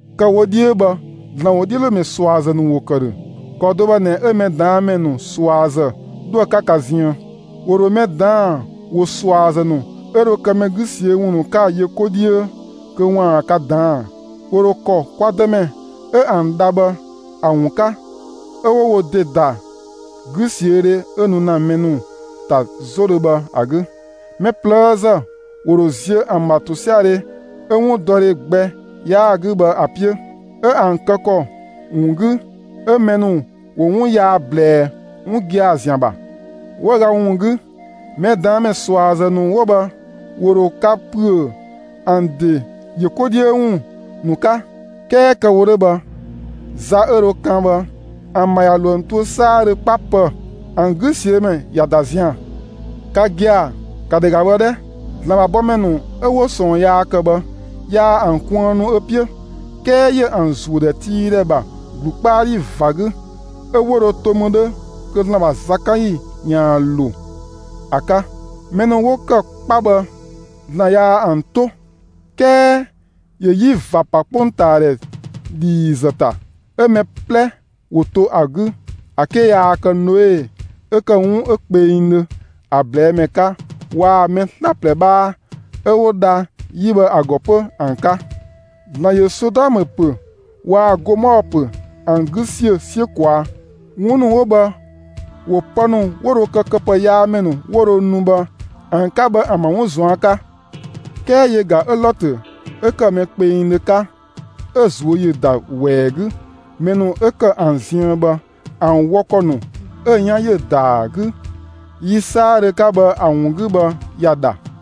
Kë‑ wo 'dhiö bhë, ‑Zlan ‑wodhiölomɛ ꞊suazë ‑nu ‑wo ‑kë ‑dhö; ‑kɔ do bhë ꞊nɛ 'ö mɛ ꞊daan' ‑mɛ ‑nu ꞊suazë 'dhoë‑ 'ka ka ziën. ‑Wo ‑dho mɛ ꞊daan' ‑wo ꞊suazë ‑nu 'ö dho kë mɛ 'gü ꞊siö'‑ ‑wun ‑nu 'ka‑ yö 'ko 'dhiö kö ‑waan ka ꞊daan'‑. ‑Wo ‑dho ‑kɔ kwa Dëmɛ 'ö ‑an dha bhë ‑a ‑wun 'ka 'ö 'wo wo ‑de ‑da 'güsiödhe 'ö nu ‑na mɛ ‑nu ‑ta 'zodhö bhë ‑a 'gü. Mɛ ꞊plëëzë ‑wo ‑dho ziö ‑an ‑bha ‑tosiadhe 'ö 'wundɔdhe gbɛ 'yaa‑ 'gü bhë ‑a 'piö; 'ö ‑an kë ‑kɔ ‑wun 'gü 'ö mɛ ‑nu ‑wo 'wun yaa ꞊blɛɛ' 'wun gia‑ ‑zian ‑bha. 'Wëüga ‑wun 'gü, mɛ ꞊daan' ‑mɛ ꞊suazë ‑nu 'wo bhë ‑wo ‑dho ka ‑püö ‑an ‑de ‑yö 'ko 'dhiö ‑wun ‑nu 'ka. 'Kɛɛ kë‑ wo 'dhö bhë, za 'ö dho kan bhë, ‑an ‑bha ꞊ya ‑lo ‑an tuö 'saadhö 'kpa ‑pë. ‑An 'güsiömɛ ꞊ya ‑da zian‑. Ka gia‑, ‑ka ‑dhɛ ‑ga bhë 'dhɛ! ‑Zlan ‑bha bɔmɛ ‑nu 'ö 'wo ꞊sɔɔn yaa ‑kë bhë, yaa ‑an kuënnu ö 'piö, 'kɛɛ ‑yö ‑an ‑zuö ‑dhɛtiidhɛ ‑bha ‑glu 'kpa 'dhi ꞊va 'gü; 'ö 'wo dho to mü 'dhö kö ‑Zlan ‑bha zakanyi ‑yaan ‑lo ‑a 'ka. Mɛ ‑nu 'wo ‑kë 'kpa bhë, ‑Zlan yaa ‑an 'to; 'kɛɛ ‑yö 'yi ꞊va ‑pa 'kpongtaadhɛ ‑dhiizë ‑ta 'ö mɛ 'plɛ ‑wo to ‑a 'gü ‑a 'ke yaa kë Noe 'ö ‑kë 'wun 'ö kpengdhö ‑a ꞊blɛɛ' ‑mɛ 'ka waa‑ mɛ 'slaplɛ 'bhaa 'ö 'wo dha 'yi bhë ‑a ‑gɔ 'pö ‑an 'ka. ‑Zlan ‑yö Sodɔmë ‑pö waa‑ Gomɔɔ ‑pö ‑an 'gü ‑siö 'siö ꞊kwaa'. 'Wun ‑nu 'wo bhë ‑wo pë ‑nu 'wo dho kë këpëyaamɛ ‑nu 'wo dho nu bhë ‑an 'ka bhë ‑an ‑bha 'wun ꞊zuan' 'ka. 'Kɛɛ yö ꞊ga 'ö Lɔtö 'ö ‑kë mɛ kpengdhö 'ka, 'ö‑ ꞊zuö' ‑yö ‑da ‑wɛɛ 'gü mɛ ‑nu 'ö ‑kë ‑an ziën bhë ‑an wɔ ‑kɔ ‑nu 'ö‑ 'yan ‑yö ‑daa 'gü yi 'saadhö 'ka bhë ‑a ‑wun 'gü bhë, ‑ya ‑dha.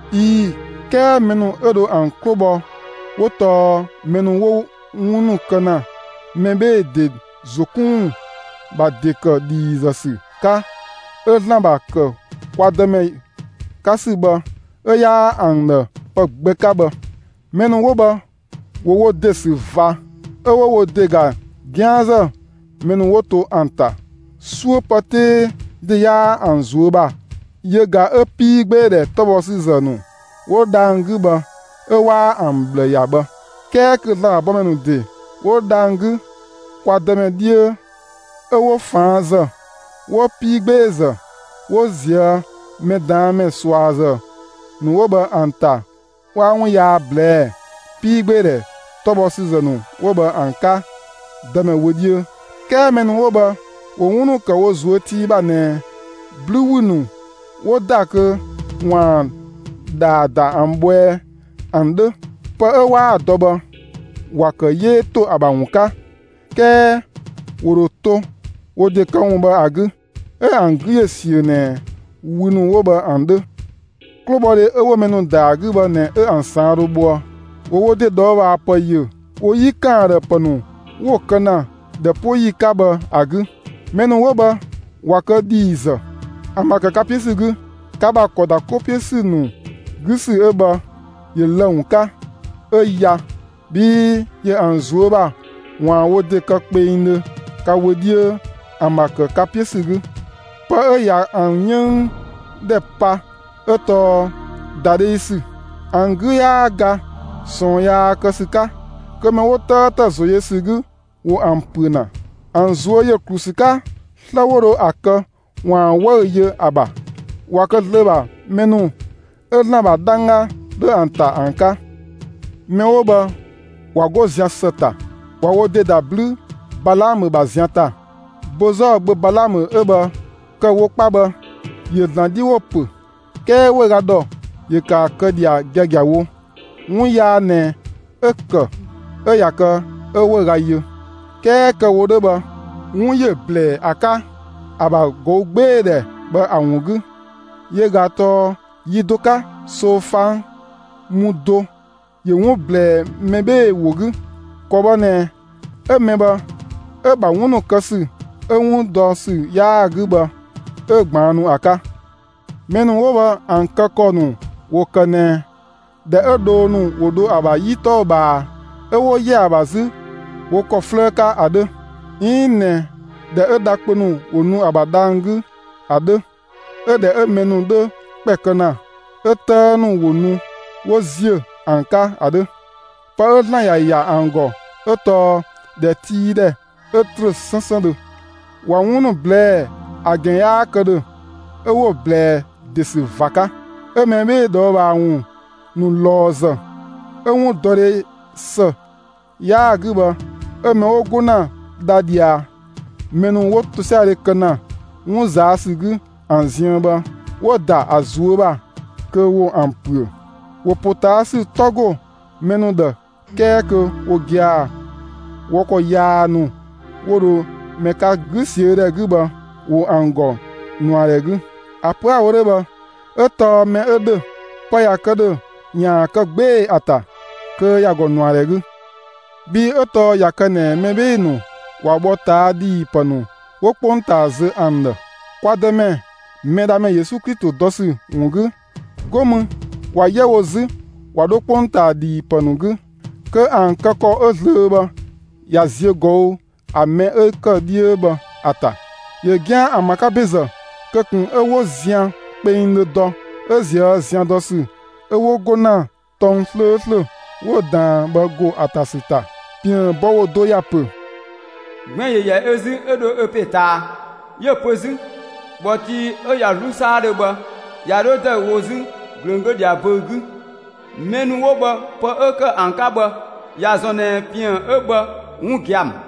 ꞊Ii‑ 'kɛɛ mɛ ‑nu 'ö dho ‑an 'klo bhɔ 'wo tɔɔ mɛ ‑nu 'wo 'wun ‑nu kë ‑na mɛ 'bhee‑ ‑de ‑zo 'kun ‑wun ‑bha ‑de ‑kë ‑dhiizë ‑sü 'ka 'ö ‑Zlan ‑bha ‑kë kwa Dëmɛ 'ka ‑sü bhë 'ö 'yaa ‑an ‑dhë pë gbɛ 'ka bhë. Mɛ ‑nu 'wo bhë, ‑wo wo ‑de ‑sü ꞊va 'ö 'wo wo ‑de ‑ga 'gianzë mɛ ‑nu 'wo to ‑an ‑ta; 'suö pë 'tee ‑de 'yaa ‑an ꞊zuö' ‑bha yö ꞊ga 'ö 'piigbeedhɛ 'tɔbhɔsüzë ‑nu 'wo dhang‑ 'gü bhë 'ö 'waa ‑an ꞊bhlë ‑ya bhë. 'Kɛɛ kö ‑Zlan ‑bha bɔmɛ ‑nu ‑de 'wo dhang‑ 'gü kwa Dëmɛ 'dhiö 'ö 'wo ꞊faanzë, 'wo 'piigbeezë 'wo ꞊zië' mɛ ꞊daan' ‑mɛ ꞊suazë ‑nu 'wo bhë ‑an ‑ta 'waa 'wun yaa ꞊blɛɛ'‑ 'piigbeedhɛ 'tɔbhɔsüzë ‑nu 'wo bhë ‑an 'ka Dëmɛ wö 'dhiö. 'Kɛɛ mɛ ‑nu 'wo bhë ‑wo 'wun ‑nu ‑kë wo ꞊zuö' tii ‑bha ꞊nɛ 'blü 'wü ‑nu 'wo ‑da kö ‑waan ‑dhaa ‑da ‑an bhɔɛɛ ‑an 'dhö. Pë 'ö 'waa‑ dɔ bhë, ‑wa ‑kë 'yee ‑to ‑a ‑bha ‑wun 'ka. 'Kɛɛ ‑wo ‑dho to wo ‑de këwun bhë ‑a 'gü, 'ö ‑an 'gü ‑yö ꞊siö ꞊nɛ wü ‑nu 'wo bhë ‑an 'dhö. 'Klobhɔdhe 'ö 'wo mɛ ‑nu ‑da ‑a 'gü bhë ꞊nɛ 'ö ‑an ꞊saan' dho bhoë. ‑Wo wo ‑de ꞊dhɔɔbhaapë ‑yö wo 'yi ‑kan ‑a ‑dhë pë ‑nu 'wo‑ kë ‑na ꞊dhɛ 'po ‑yi 'ka bhë ‑a 'gü. Mɛ ‑nu 'wo bhë ꞊wa kë ‑dhiizë; ‑an ‑bha ‑kë ka 'piö ‑sü 'gü ka ‑bha ‑kɔ ‑da 'ko 'piö ‑sü ‑nu 'gü ‑sü 'ö bhë, ‑yö lë‑ ‑wun 'ka, 'ö ya; bhii ‑yö ‑an ꞊zuö' ‑bha ‑waan wo ‑de kë kpengdhö ka wö 'dhiö ‑an ‑bha ‑kë ka 'piö ‑sü 'gü. Pë 'ö ꞊ya ‑an 'yënng ‑dhɛ pa 'ö tɔɔ ‑dadheüsü. ‑An 'gü 'yaa ga ꞊sɔɔn yaa kë ‑sü 'ka; kö mɛ 'wo 'tëëtë ‑zo yö ‑sü 'gü ‑wo ‑an ‑püö ‑na. ‑An ꞊zuö' ‑yö ‑klu ‑sü 'ka 'slë 'wo dho ‑a kë ‑waan 'wëü‑ yö ‑a ‑bha; ꞊wa kë zlöö ‑bha mɛ ‑nu 'ö ‑Zlan ‑bha 'dhangga 'dhö ‑an ‑ta ‑an 'ka. Mɛ 'wo bhë ꞊wa 'go zian ‑së ‑ta, ꞊wa wo ‑de ‑da 'blü Balaamö ‑bha zian ‑ta. Bozɔɔ gbö Balaamö 'ö bhë kë‑ wo 'kpa bhë, ‑yö ‑Zlan 'dhi ‑wo ‑pö; 'kɛɛ 'wëüga ‑dhɔ ‑yö ‑kë ‑a kë ꞊dhia giagiawo. 'Wun yaa ꞊nɛ 'ö‑ ‑kë 'ö ꞊ya kë 'ö 'wëüga yö. 'Kɛɛ kë‑ wo 'dhö bhë, 'wun ‑yö ‑blɛɛ ‑a 'ka ‑a ‑bha ꞊gɔügbeedhɛ bhë ‑a ‑wun 'gü; yö ꞊ga tɔɔ yi do 'ka, ꞊soofang mu do ‑yö 'wun ꞊blɛɛ mɛ 'bhee‑ ‑wo 'gü; ‑kɔ bhë ꞊nɛ 'ö mɛ bhë, 'ö‑ ‑bha 'wun ‑nu kë ‑sü 'ö 'wun dɔ ‑sü 'yaa‑ 'gü bhë, 'ö ꞊gbaannu ‑a 'ka. Mɛ ‑nu 'wo bhë ‑an kë ‑kɔ ‑nu ‑wo ‑kë ꞊nɛ ‑dhɛ 'ö dhoo ‑nu ‑wo dho ‑a ‑bha 'yi 'tɔɔ‑ ꞊bhaa 'ö 'wo‑ ‑yɛ ‑a ‑bha wo ‑kɔ 'flëë 'ka ‑a 'dhö, 'iin ꞊nɛ ‑dhɛ 'ö dha kpö ‑nu ‑wo nu ‑a ‑bha dhang‑ 'gü ‑a 'dhö; 'ö ‑dhɛ 'ö mɛ ‑nu 'dhö ‑kpɛ kë ‑na, 'ö 'tëë ‑nu ‑wo nu 'wo ‑ziö ‑an 'ka ‑a 'dhö. Pë 'ö ‑Zlan ‑ya ‑ya ‑an ‑gɔ 'ö tɔɔ ‑dhɛtiidhɛ 'ö ‑trö 'sënsëndhö. ꞊Wa 'wun ‑nu ꞊blɛɛ', ‑a ‑gɛn 'yaa kë ‑dhö 'ö 'wo‑ ꞊blɛɛ ‑de ‑sü ꞊va 'ka; 'ö mɛ 'bhee‑ ꞊dhɔɔbhaa ‑wun ‑nu ꞊lɔɔzë 'ö 'wundɔdhe ‑së 'yaa‑ 'gü bhë 'ö mɛ 'wo 'go ‑na dha ꞊dhia mɛ ‑nu 'wo ‑tosiadhe kë ‑na 'wun ꞊zaa' ‑sü 'gü ‑an ziën bhë, 'wo‑ ‑da ‑a ꞊zuö' ‑bha kö ‑wo ‑an ‑püö. ‑Wo ‑potaasü 'tɔ go mɛ ‑nu ‑dhë 'kɛɛ kö wo gia‑, wɔ ‑kɔ yaa ‑nu 'wo dho mɛ 'ka 'gü ꞊siö' ‑dhɛ 'gü bhë, ‑wo ‑an ‑gɔ ꞊nuadhɛ 'gü. ‑A pö 'a‑ wo 'dhö bhë, 'ö tɔɔ mɛ 'ö ‑dhö, pë ꞊ya kë ‑dhö ‑yaan kë 'gbee‑ ‑a ‑ta, kö ‑ya ‑gɔ ꞊nuadhɛ 'gü. Bhii 'ö tɔɔ ꞊ya kë ꞊nɛ mɛ 'bhee‑ ‑nu ꞊wa bhɔ ꞊taa' ‑dhiipë ‑nu 'wo 'kpongtaa zö ‑an ‑dhë, kwa Dëmɛ, Mɛdhamɛ Yesu Klito dɔ ‑sü ‑wun 'gü, 'go mü ꞊wa 'yɛ wo 'zü ꞊wa 'dho 'kpongtaa ‑dhiipë ‑nu 'gü, kö ‑an kë ‑kɔ 'ö zlöö bhë ꞊ya ziö ꞊gɔü' ‑a mɛ 'ö ‑kë 'dhiö bhë ‑a ‑ta. ‑Yö 'gian ‑an ‑bha 'ka ‑bezë kö ꞊kun 'ö 'wo zian kpengdhö dɔ 'ö ꞊zië' zian dɔ ‑sü, 'ö 'wo 'go ‑na tɔng 'slööslö 'wo‑ ꞊daan bhë ‑go ‑a ‑ta ‑sü ‑ta. ‑Piën bɔ ‑wo do ‑ya ‑pö: Gbɛn‑ ‑yö 'yɛ ö 'zü 'ö 'dho ö ‑pe ꞊taa. 'Yö‑ pö 'zü: ‑Bhɔ tii 'ö ꞊ya 'zlu 'saadhö bhë, ꞊ya 'dho ‑dëüwo 'zü ꞊glöng 'glö ꞊dhia böü‑ 'gü. (Mɛ ‑nu 'wo bhë, pë 'ö ‑kë ‑an 'ka bhë, ‑ya ‑zɔn ꞊nɛ ‑piën 'ö bhë 'wun gia‑ ‑mü.)